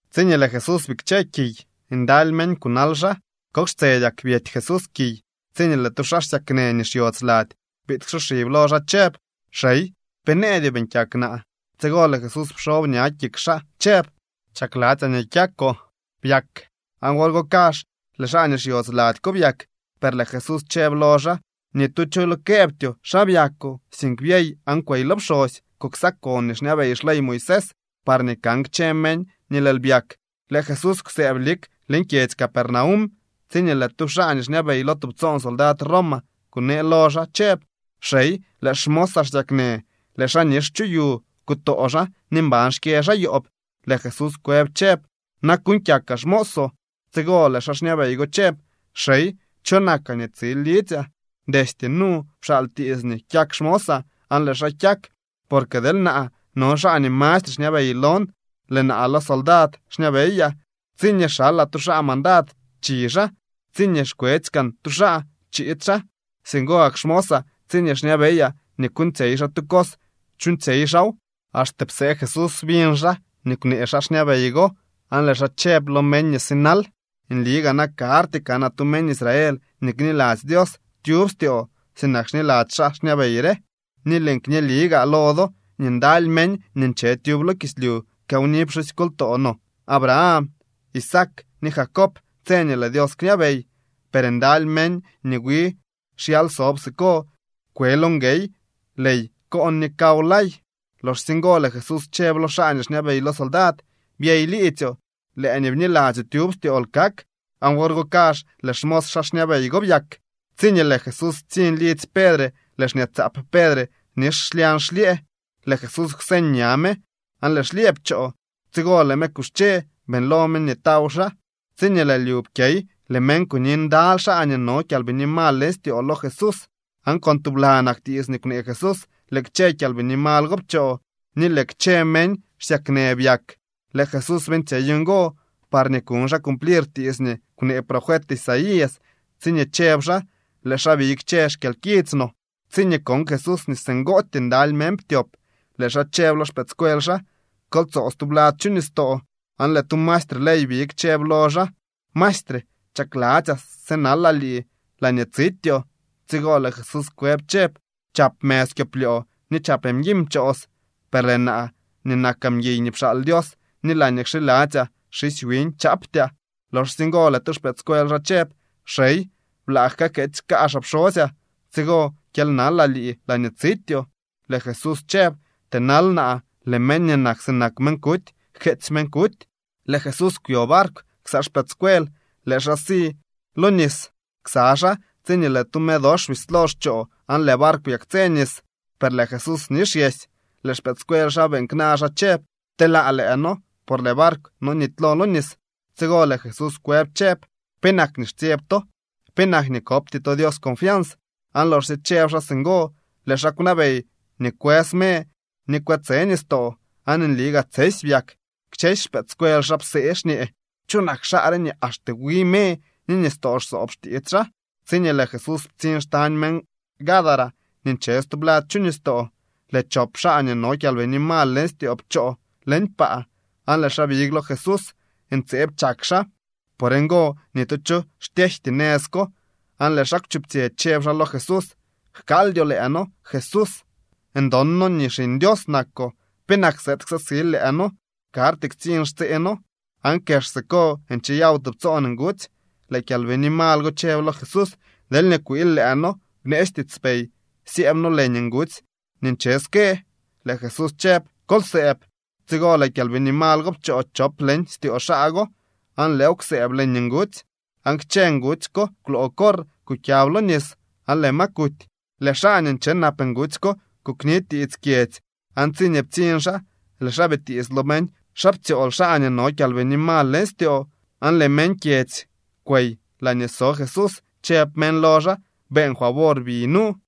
Tsiñee lëë Jesús bikche kiy, ndaly meñ kunal xaa. Kok xtsedyak byety Jesús kiy tsiñee lëë tu xaa xsyaknë nii xyodz lady biid ksoxib lo xaa chëb: —Xey, pe nëëdyoo beeñ kyak naa. Tsigo lëë Jesús pxob ña kik xaa chëb: —Chakladzyaa nii kyakoo. Byak. Aan wor go kazh lëë xaa nii xyodz lady ko byak. Per lëë Jesús chëb lo xaa: —Ni tu cho lo këëbtyoo xa byakoo, sink byey aan kwey lo pxosy. Kuksakon nii xñabey xley Moisés parñee kan kchë meñ nii lëël byak. Lëë Jesús kwsëëb lik leñ kyedzy Capernaum tsiñee lëë tu xaa nii xñabey lo tubtsoon soldad Roma kunee lo xaa chëb: —Xey, lëë xmosaa xsyaknë. Lëë xaa nix chu yu, kutoo xaa ni mban xkyë xaa yoob. Lëë Jesús kwëb chëb: —Naa kuuñ kyakaa xmoosoo. Tsigo lëë xaa xñabey go chëb: —Xey, cho nakaa nii tsil lidzyaa. Destye nu pxaal tiits nii kyak xmosaa aan lëë xaa kyak. Porque deel naa, no xaa nii mastre xñabey lon, lëë naa lo soldad xñabeyaa. Tsiñee xalaa tu xaa mandad, chi xaa. Tsiñee xkwetsy kaan tu xaa, chiid xaa. Singo gak xmosaa tsiñee xñabeyaa nii kuuñtsyey xaa tu cos, chuuñtsyey xaaw. Axte psee Jesús biñ xaa nii kwnee xaa xñabey go, aan lëë xaa chëb lo meñ nii sinal: —Nli gaa na karty kanaa tu meñ Israel nii kniladzy Dios tyub styoo sinak xniladzy xaa xñabey re. Ni lëën kñeli gaa lo do nii ndaly meñ nii nche tyub lo kislyu kawni pxusykoltoo no Abraham, Isaac ni Jacob tse nii lëë Dios kñabey. Per ndaly meñ nii wi xyal sob siko kwe lo nguey ley koon ni kaw lay. Loxsye ngo lëë Jesús chëb lo xaa nii xñabey lo soldad: —Byey liidzyoo. Lëë nii bniladzyoo tyub styool kak. Aan wor go kazh lëë xmos xaa xñabey go byak. Tsiñee lëë Jesús ptsiñ lidzy Pedre lëë xñaatsaap Pedre nix xlyañ xlyëë. Lëë Jesús kwseñ ña me, aan lëë xlyëë pchoo. Tsigo lëë me kuxche beeñlo me nii taw xaa. Tsiñee lëë lyu pkyey, lëë meñ kuni ndaly xaa nii no kyalbini mal leñ styoo lo Jesús. Aan con tublanak tiits nii kwnee Jesús lëë kchë kyalbini mal go pchoo ni lëë kchë meñ xsyaknë byak. Lëë Jesús beeñtsyey ngo parñee kuñ xaa cumplir tiits nii kwnee profet Isaías tsiñee chëb xaa: “Lëë xaa biy kchë xkyalkits no.” Tsiñee kon Jesús nii singootyee ndaly meñ ptyop, lëë xaa chëb lo xpëëdscuel xaa: —Kol tsoo stublad chu nistoo. Aan lëë tu maestre ley big chëb lo xaa: —Maestre, chakladzyaa sënalaa lii laañee tsityoo. Tsigo lëë Jesús kwëb chëb: —Chap mëz kyoplyoo ni chap mguiñ pchoos, per lëë naa nii nakaa mguiy nii pxaal Dios ni laañee kxiladzyaa xisy wiñ chaaptyaa. Loxsye ngo lëë tu xpëëdscuel xaa chëb: —Xey, blaa kajkeetsy kaazhaa pxosyaa, tsigo kyely nalaa lii laañee tsityoo. Lëë Jesús chëb: —Tënal naa. Lëë meñ nii nak sinak meñ kuty jkeetsy meñ kuty. Lëë Jesús kwyo barkw ksa xpëëdscuel. Lëë xaa si lo nis ksa xaa, tsiñee lëë tu me dox bislo xchoo aan lëë barkw byaktsë nis. Per lëë Jesús nixyesy. Lëë xpëëdscuel xaa beeñ kna xaa chëb: —¡Pteelaa lëë noo, por lëë barkw nonity leñ nis! Tsigo lëë Jesús kwëb chëb: —¿Penak nii xtsyeb to? ¿Penak nii kopty to Dios confians? Aan loxsye chëb xaa singo lëë xaa kwnabey nii kwës me ni kwe tse nistoo, aan nli gaa tsesy byak. Kchësy xpëëdscuel xaa psee xñee: —¿Cho nak xaa re nii axte wi me ni nistoo xsoob xtiits xaa? Tsiñee lëë Jesús ptsiñ xtañ meñ Gadara nii nche stublad chu nistoo, lëë chop xaa nii no kyalbini mal leñ styoo pchoo leñ paa aan lëë xaa big lo Jesús. Ntseeb chak xaa. Por ngo ni tu cho xtyejty nëz ko. Aan lëë xaa kwchuptsyë chëb xaa lo Jesús: —Jkaaldyoo lëë noo, Jesús. Ndon noo nii Xiñ Dios nakoo. ¿Penak sëëd ksaksil lëë noo? Karty ktsiñ xtsee noo. Aan kex siko ncheyaw tubtsoon ngutsy. Lëë kyalbini mal go chëb lo Jesús: —Deelñee kwiil lëë noo, bneetsy tiitspey syëëb noo leñ ngutsy nii nche ske. Lëë Jesús chëb: —Kol sëëb. Tsigo lëë kyalbini mal go pchoo chop leñ styoo xaa go, aan lëëw kwsëëb leñ ngutsy. Aan kchë ngutsy ko kwloo corr kukyab lo nis aan lëë ma kuty. Lëë xaa nii nche nap ngutsy ko kuknitiits kyedzy, aan tsiñee ptsiñ xaa, lëë xaa bitiits lo meñ xa ptsyool xaa nii no kyalbini mal leñ styoo. Aan lëë meñ kyedzy kwey laañee so Jesús, chëb meñ lo xaa: “Beeñ favor, bi nu.”